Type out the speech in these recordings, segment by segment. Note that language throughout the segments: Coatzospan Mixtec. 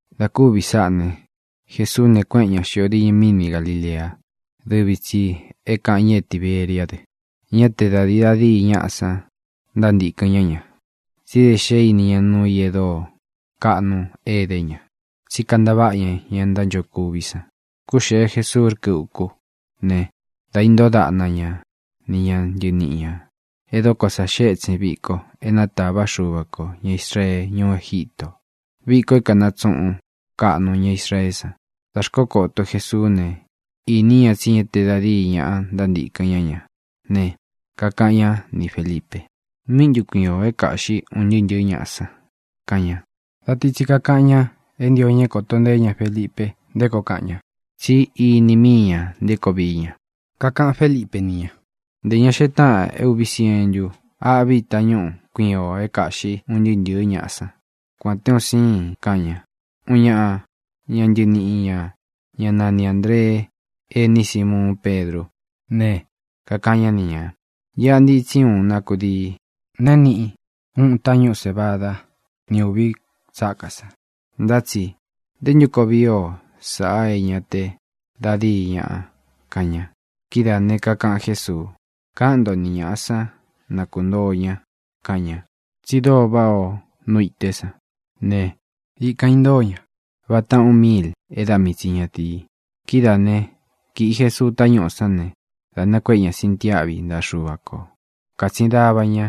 Dā kúvī sáꞌā ne, Jesuú ne, kuéꞌen ña xīo diñɨ míni Galīlea, dɨ́vi tsī é kākaꞌan ña é Tiberiá dɨ. Ñá te da dīi da díi ñáꞌa san ntántīkɨn ñá ña, tsí da xé īni ña nuu i e dóo kaꞌnu é kade ña, tsí kantaváꞌa ña ña ntánchokuví san. Kúxēe Jesuu rkɨ́ ukú ne, da intóo daꞌna ña ni ña ntɨniꞌi ñā. E dokó sa xée ētsin viko é nátava Xuva kō ña Israee ñuú Egítō, viko é kanatsuꞌun kaꞌnu ña Israeé san. Dā xkókoto Jesuú ne, īní ña tsí ña te da díi ñaꞌa ntántīkɨn ñá ña ne, kakaꞌan ñá ni Fēlipe: —¿Míꞌi ntū kíkuiin o é kāꞌxí un ntɨɨ́ ntɨ̄ɨ́ ñaꞌa san? —kaꞌan ña. Da ti tsi kakaꞌan ña é ntio ña é kōto nteé ña Felipe nté koo kaꞌan ña. Tsí ini míi ñā nté koo vií ña. Kakaꞌan Félipe ni ña: —Ntē ña xee táꞌan é ūvi sientu âꞌví tañúꞌu kuiin ō é kāꞌxi un ntɨɨ́ ntɨ̄ɨ́ ñaꞌa san, kuān té un síin —kaꞌan ña. Uun ñaꞌa ña ntɨniꞌi ñā, ñá nani Āndree, ení Simuun Pedrú ne, kakaꞌan ñá ni ñā: —Iꞌa ntitsí uun na kudii, na é niꞌi úꞌūn tañúꞌu sēvada ni úvi tsákā san, ntá tsi ¿nté ntu koo vii o sáꞌa é ña te da díi ñaꞌa? —kaꞌan ña. Kidáā ne, kakaꞌan Jésuu: —Káꞌan nto ni ñāꞌa sán, na kūntoo ña —kaꞌan ña. Tsi dóo váꞌā o nú ité san ne, ikan īntóo ña, vata ūꞌun míil é da mii tsi ñatīi. Kidáa ne, kīꞌi Jesuu tañúꞌū sán ne, dā nakuéꞌe ña sintiáꞌvi ntaꞌa Xuva kō. Kātsin dava ñá,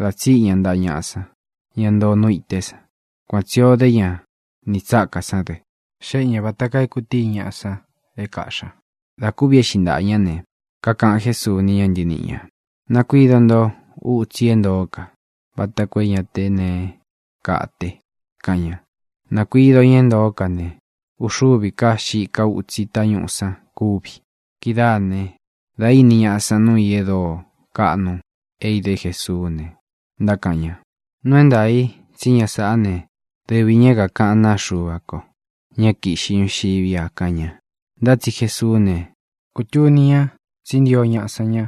dā tsíꞌi ña ntaꞌa ñaꞌa san, ña ntoo nú īté san. Kuan tsī o dé ña nī tsákā sán dɨ. Xéꞌe ñā vata kaa e kutíi ñaꞌa san é kaꞌxí ña. Dā kúvi éꞌxi ntāꞌa ñá ne, kakaꞌan Jésuu ni ña ntɨníꞌi ñā: —Nakuido nto utsi i é ntoó ka vata koo é ña te neé kate —kaꞌan ña. Nākuido ña é ntoó ka ne, uxúvī ká xika útsi tañúꞌū san kúvi. Kidáa ne, dā íni ñaꞌa san nuu i e dóo kaꞌnu é idé Jesuú ne, ntákaꞌan ña: —Nuu é ntaā i tsí ña sāꞌá ne, dɨvi ñā é kākaꞌán naa Xuva ko, ña é kīꞌxí ñuxiví a —kaꞌan ña. Ntá tsi Jesuú ne, kūtuni ña tsí ntio ñaꞌa san ña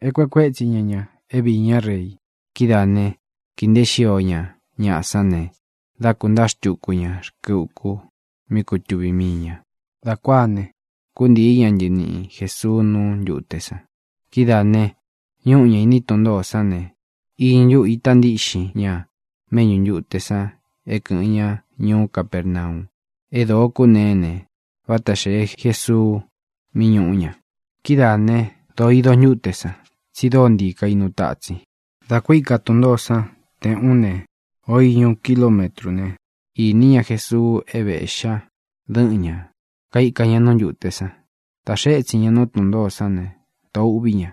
é kueꞌe kuétsi ña ña é viī ñá rei. Kidáā né, kīi nteé xio ña ñaꞌa sán ne, dā kuntáa xtuku ña rkɨ uku, mí kutuvī mii ña. Dā kuáā ne, kúntīí ña ntɨniꞌi Jēsuu nú ntūte san. Kidáā ne, ñúꞌu ña īní tun ntōó san ne, īñɨ ntúꞌu ita ntíꞌxin ña méꞌñū ntute san é kɨ̄ꞌɨn ñá ñuú Capernau. É dōo kúneé ne, váta xēe Jesuu mí ñūꞌu ña. Kidáā né, dōo ido ntúte san, tsi dóo ntii kainu tatsin. Dā ku íka tun ntōó san te ūꞌún ne, o īñu kilumétru ne, īní ña Jesuu é vēꞌxí ña dɨ́ꞌɨn ña, kaika ña nú ntūte san. Dā xee étsin ña nú tun ntōó san ne, dōo úꞌvī ña.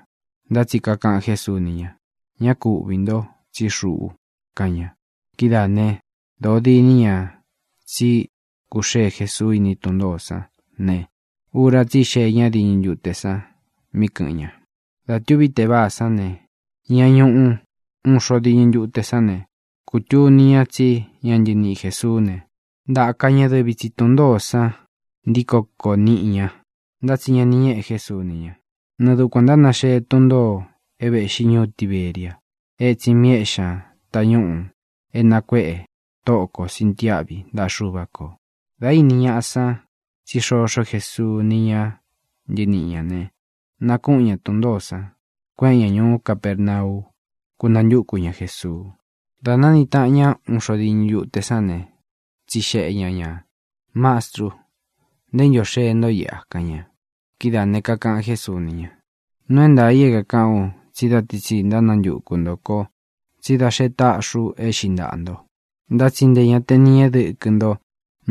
Ntá tsi kakaꞌan Jésuu ni ña: —Ñá ku uꞌvī nto, tsí xuꞌu —kaꞌan ña. Kidáā né, dōo diní ña tsí kūxée Jesuu iní tun ntōó san ne, ura tsí xee ñá diñɨ ntute san mí kɨ̄ꞌɨn ña. Dā tuví teváā sán ne, ña ñuꞌu uun xo diñɨ ntute sán ne, kūtuni ñá tsí ña ntɨniꞌi Jēsuú ne, ntāka ña dɨvi tsi tun ntōó san ntíko kōo niꞌi ña, ntá tsi ña ni ñéꞌe Jésuu ni ña. Nɨɨ̄ dukuan ntánaxee tun ntōo é vēꞌxí ñuú Tiberia, etsin mi éꞌxi ña tañúꞌū é nakuéꞌe Tóꞌo kō sintiáꞌvi ntaꞌa Xuva kō. Dā íni ñaꞌa san tsí xoxó Jesuu ni ña ntɨníꞌi ñā ne, nakúꞌun ña tun ntōó san, kueꞌen ña ñuú Capernau, kúnantúku ña Jēsuu. Dā nániꞌi taꞌan ña uun xo diñɨ ntúte sán ne, tsixeꞌe ña ñā: —Mastrú, ¿nté ntu ō xee ntó iꞌa? —kaꞌan ña. Kidáā ne, kakaꞌan Jésuu ni ña: —Nuu é ntaā i é kākaꞌán u tsí da ti tsi ntánantuku ntō ko tsí da xe táꞌxi ú e éꞌxi ntaꞌā nto, ntá tsi ntē ña te ni ñéꞌe dɨkɨ nto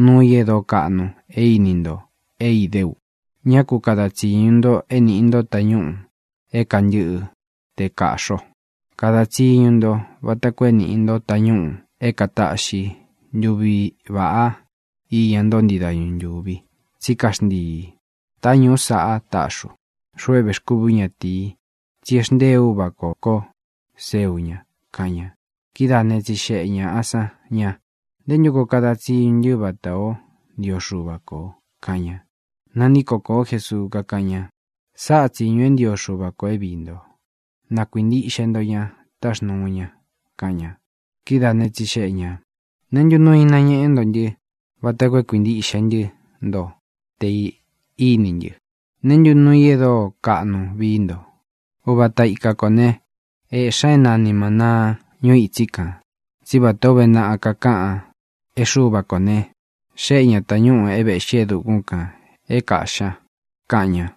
nuu i e dóo kaꞌnu e íni nto é idé u. Ñá ku kada tsīñu nto é nīꞌi nto tañúꞌū é kantɨ́ꞌɨ te kāꞌxi o. Kada tsiñu nto vata koo é nīꞌi nto tañúꞌū é kataꞌxi ntuvi vāꞌá iña nto ntii dañu ntúvi, tsí kaxntiī. Táñūꞌú saꞌá taꞌxi ú, xuꞌu é vēxkúvi ú ñatīi, tsí e xntée Uvā kó ko seu ña —kaꞌan ña. Kidáā ne, tsixeꞌe ñāꞌa san ña: —¿Ntē ntú koo kada tsiñu ntɨ́ vatā ó ntio Xuva ko? —kaꞌan ña. Nantíko kōó Jesuu, kakáꞌan ña: —Sáꞌa tsīñu é ntio Xuva ko é viī nto: Na kuīntiꞌxe nto ña táxnūu ña —kaꞌan ña. Kidáa ne, tsixeꞌe ñā: —¿Neé ntu nuu i nañéꞌe ntó ntɨ vata koo é kuīntiꞌxe ntɨ́ nto tē íni ntɨ? ¿Neé ntu nuu i e dóo kaꞌnu vií nto? Uva ata ika kō ne, éꞌxi ña é nani mānaa ñuu itsí kān. Tsí vatā ó uve naꞌa kakáꞌan é Xuva kō ne, xéꞌe ñā tañúꞌū é vēꞌxí e dukún kān é kāꞌxí ña —kaꞌan ña.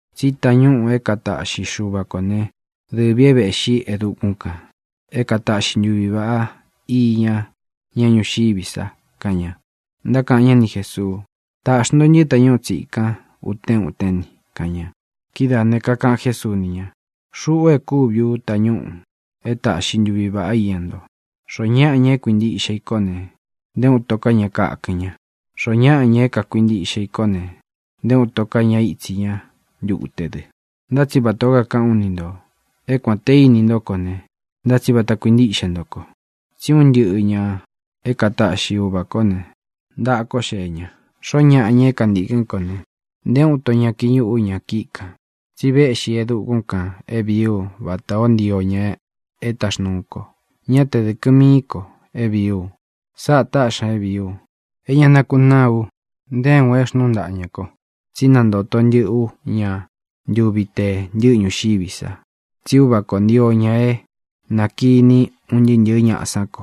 Tsí tañúꞌū é kataꞌxi Xuva kō né, dɨvī é vēꞌxí e dukún kān, é kataꞌxi ntuvi vāꞌá iña ña ñuxiví sa —kaꞌan ña. Ntákaꞌan ñá ni Jēsuu: —Tāꞌxi nto ntɨ́ tañúꞌu tsīkan utén utén ni —kaꞌan ña. Kidáā ne, kakaꞌan Jésuu ni ña: —Xuꞌu e kúvi ú tañúꞌū é taꞌxi ntuvi vāꞌá iña nto. Xoó ñaꞌa, ña é kuntīkɨn í ko ne, nté uun ito ká ña kakɨn ña. Xoó ñaꞌa, ña é kakuintiꞌxe i kó ne, nté uun ito ka ña ítsī ñá ntute dɨ. Ntá tsi vatā ó kakaꞌán u ni ntō é kuān té ini ntó ko ne, ntá tsi vata kuintíꞌxe nto ko. Tsí un ntɨꞌɨ ñā é kataꞌxi Uvā kó ne, ntaꞌa kó xee ña. Xoó ñaꞌa, ña é kantīkɨ́n ko ne, nté uun ito ña kiñūꞌu ú ña kíꞌi kān. Tsi véꞌxi ú e dukún kān é vīí u vatā ó ntio ña é taxnūu ko, ñá tē dɨkɨ tsi mií ko vií u. Sáꞌā táꞌxi ña é vīí u: é ña nakunáa u nté uun e xnúu ntaꞌa ñā ko, tsí nantōto ntɨꞌɨ ú ña ntuvi te ntɨ́ꞌɨ ñuxiví sa. Tsí Uvā ko ntio ña é na kīní un ntɨꞌɨ ñāꞌa sán ko,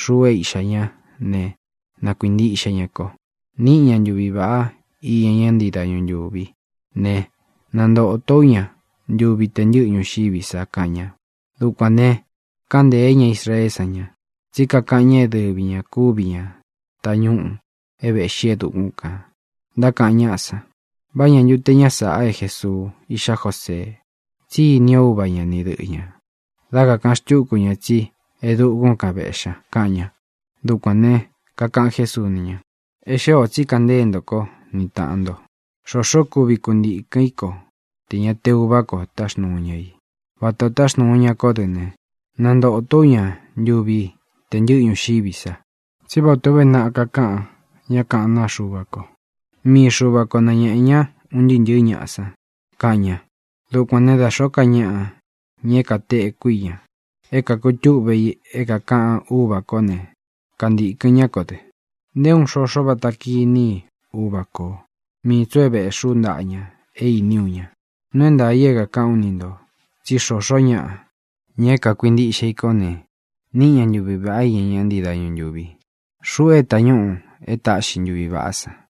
xuꞌu é Iꞌxā ñá ne, na kuīntiꞌxe ña ko. Níꞌi ña ntuvi vāꞌá iña ña ntii dañu ntúvi ne, nantōtó u ña ntuvi te ntɨ́ꞌɨ ñuxiví sa —kaꞌan ña. Dukuān ne, káꞌan ntēé ña Israeé san ña, tsí kakaꞌan ña é dɨvi ñā kúvi ña tañúꞌū é vēꞌxí e dukún kān. Ntákaꞌan ñáꞌa san: —¿Vá ña ntu te ña sāꞌa é Jēsuu, iꞌxá Josee? Tsí ini o úva ña ni dɨꞌɨ ñā. Dá kakāꞌan xkú ña tsí e dukún kan vēꞌxí ña —kaꞌan ña. Dukuān ne, kakaꞌan Jésuu ni ña: —E xée ō tsí kaꞌan ntée nto kó ni tāꞌan nto. Xoxó kuvi kuntīkɨ́n i ko tē ña te Uvá ko táxnuu ña i, vata ō táxnuu ña kó dɨ ne, nantōtó u ña ntuvi te ntɨ́ꞌɨ ñuxiví sa. Tsí vatā ó uve naꞌa kakaꞌan ña kaꞌán naa Xuva ko: “Mii Xuva ko nañēꞌe ña un ntɨɨ́ ntɨ̄ɨ́ ñaꞌa san”, kaꞌan ña. Dukuān né, dā xóo ká ñaꞌa, ña é kateku í ña, é kakutúꞌve i é kākaꞌan Úvā kó ne, kantīkɨn ñá ko dɨ. ʼNté uun xoxo vata kiní i Uva kō. Mii tsī u é vēꞌxí u ntaꞌa ña é īní u ña. Nuu é ntaā i é kākaꞌán u ni ntō tsí xoo ñáꞌa, ña é kuintiꞌxe i kó ne, níꞌi ña ntuvi vāꞌá iña ña ntii dañu ntúvi. Xuꞌu é tañúꞌū é taꞌxi ntuvi vāꞌá san.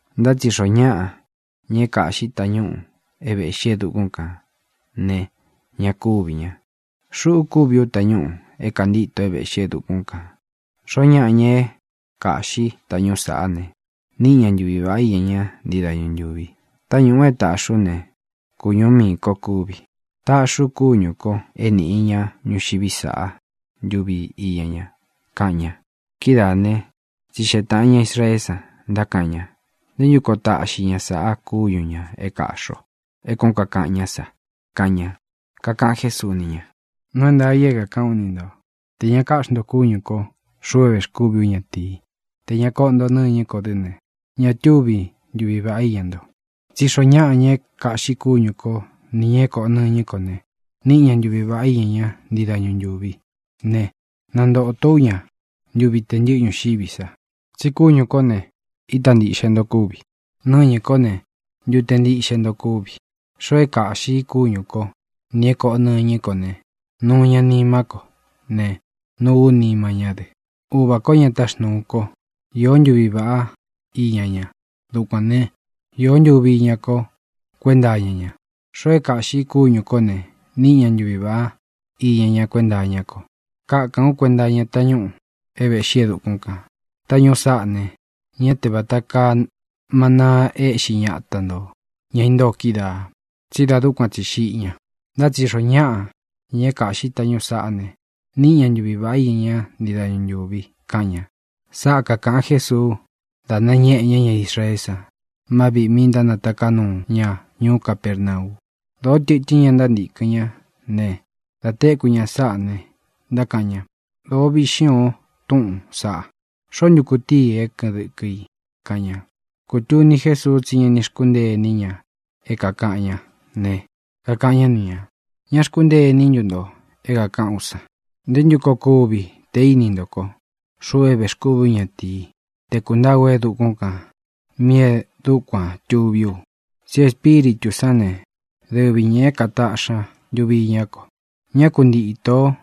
Ntá tsi xoo ñáꞌa, ña é kāꞌxí i tañúꞌū é vēꞌxí e dukún kān ne, ña kúvī ña. Xuꞌu kúvi ú tañúꞌū é kāntíto é vēꞌxí e dukún kān. Xoó ñaꞌa, ña é kāꞌxí tañúꞌu sāꞌá ne, níꞌi ña ntuvi vāꞌá iña ña ntii dañu ntúvi. Táñūꞌu é tāꞌxi ú ne, kūñú miī kó kúvi. Taꞌxí u kúñū ko é nīꞌi ña ñuxiví sa ntuvi iña ña —kaꞌan ña. Kidáa ne, tsixeꞌe tāꞌan ña Israeé san, ntákaꞌan ña: —¿Ntē ntú koo taꞌxi ña sāꞌa kúñu ñā é kāꞌxi o, é kuān ó kakaꞌan ñá sa? —kaꞌan ña. Kakaꞌan Jésuu ni ña: —Nuu é ntaā i é kākaꞌán u ni ntō: Tē ña káꞌxi nto kúñū ko, xuꞌu é vēxkúvi ú ñatīí, tē ña koꞌo nto nɨ́ñɨ́ ko dɨ́ ne, ña túvi ntuvi vāꞌá iña nto. Tsí xoo ñáꞌa, ña é kāꞌxí kúñū kó, nī ña é kōꞌo nɨñɨ́ ko ne, níꞌi ña ntuvi vāꞌá iña ña ntii dañu ntúvi ne, nantōto ú ña ntuvi tē ntɨ́ꞌɨ ñuxiví sa. Tsi kúñū kó ne, ita ntíꞌxe nto kuvi; nɨñɨ́ ko ne, ntute ntiꞌxe nto kúvi. Xoo é kāꞌxí i kúñū kó, nī é kōꞌo nɨñɨ́ ko ne, nuu ña nimá ko ne, nuu ú nima ñá dɨ. Uva kō, ña táxnūu kó, īó ntuvi iña ña. Dukuān né, īó ntuvi iñá ko kuenta iña ña. Xoo é kāꞌxí i kúñū kó ne, níꞌi ña ntuvi vāꞌá iña ñá kuenta iñá ko. Kakaꞌán u kuenta iña tañúꞌū é vēꞌxí e dukún kān. Táñūꞌú saꞌá ne, ñá te vāta kaa manaa e éꞌxi ñata ntō, ña intóo kídaā, tsí dā dúkuan tsi xiꞌi ña. Ntá tsi xoó ñaꞌa, ña é kāꞌxi tañúꞌū saꞌá ne, níꞌi ña ntuvi vāꞌá iña ña ntii dañu ntúvi —kaꞌan ña. Sáꞌa kākaꞌan Jésuu dá nañéꞌe ña ña Israeé san má viꞌī mí ntánataká nuu ña ñuú Capernau. Dōó tɨtɨ́n ña ntántīkɨn ñá ne, dā téku ña sáꞌa ne, ntákaꞌan ña: —Dōo viꞌxín ō túꞌūn saꞌa. ¿Xoó ntu kutií i é kɨꞌɨn dɨkɨ i? —kaꞌan ña. Kūtuni Jésuu tsí ña ni xkúntee iní ña é kākaꞌan ñá ne, kakaꞌan ñá ni ñā: —¿Ñá xkúntee iní ntu nto é kākaꞌán u san? ¿Ntē ntú koo kuvi tē íni nto ko, xuꞌu é vēxkúvi ú ñatīí, te kūntáa u e dukún kān míꞌī e dúkuān tuví u? Tsí Espíritū sán ne, dɨvi ñā é kātaꞌxi ña ntuvi iña ko. Ña kuntīto ó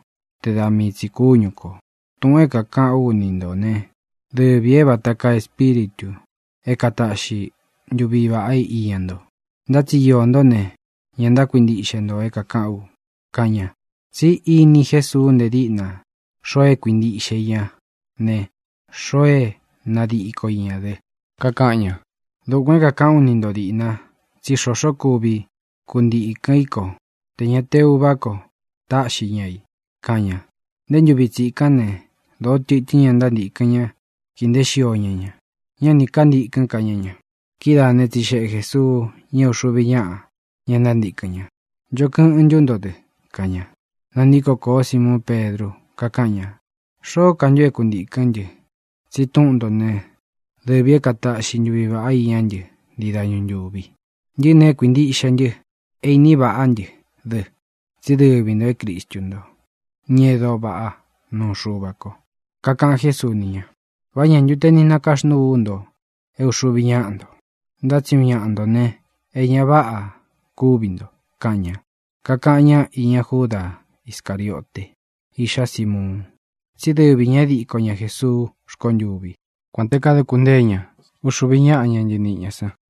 te da mii tsī kúñu kō. Tūꞌun é kākaꞌán u ni nto ne, dɨvī é vata kaa espíritū é kataꞌxi ntuvi vāꞌá iña nto. Ntá tsi iō ntó ne, ña ntákuintiꞌxe nto é kākaꞌán u —kaꞌan ña. Tsí iní Jesuu nte díꞌna xoo é kuintíꞌxe i ña ne, xoo é nadíko i ñā dɨ. Kakaꞌan ña: —Dukuān é kākaꞌán u ni nto dīꞌna tsí xoxó kuvi kuntīkɨn í ko tē ña te Uvá ko táꞌxi ña i —kaꞌan ña. Nté ntūvi tsikán ne, dōó tɨtɨ́n ña ntántīkɨn ña, kii nteé xio ña ña. Ñá nī kántīkɨ́n ka ñá ña. Kidáā né, tsixeꞌe Jēsuu ña é uxuvi ñáꞌa, ña ntántīkɨn ña: —¿Ncho kɨꞌɨn ntú nto dɨ? —kaꞌan ña. Nantíko kōó Simuun Pedru, kakáꞌan ña: —Xoó ka ntu é kuntīkɨ́n ntɨ, tsi túꞌun ntō né, dɨvī é kataꞌxi ntuvi vāꞌá iñá ntɨ ntii dañu ntūvi. Ntɨꞌɨ́ ne, é kuīntiꞌxe ntɨ, é īni vaꞌá ntɨ dɨ tsí dɨvi ntō é Cristu nto, ña e dóo vaꞌá nuu Xuva ko. Kakaꞌan Jésuu ni ña: —¿Vá ñā ntu te ni nakaxnúu ú nto, é uxuvi ñáꞌa nto? Ntá tsi uun ñaꞌa ntō ne, e ña váꞌa kúvi nto —kaꞌan ña. Kakaꞌan ñá iña Júda Iscariote, iꞌxá Simuun. Tsí dɨvi ñā é diko ña Jēsuu rkontûvi, kuān té kaduku ntée ña uxuvi ñáꞌa, ña ntɨniꞌi ñā san.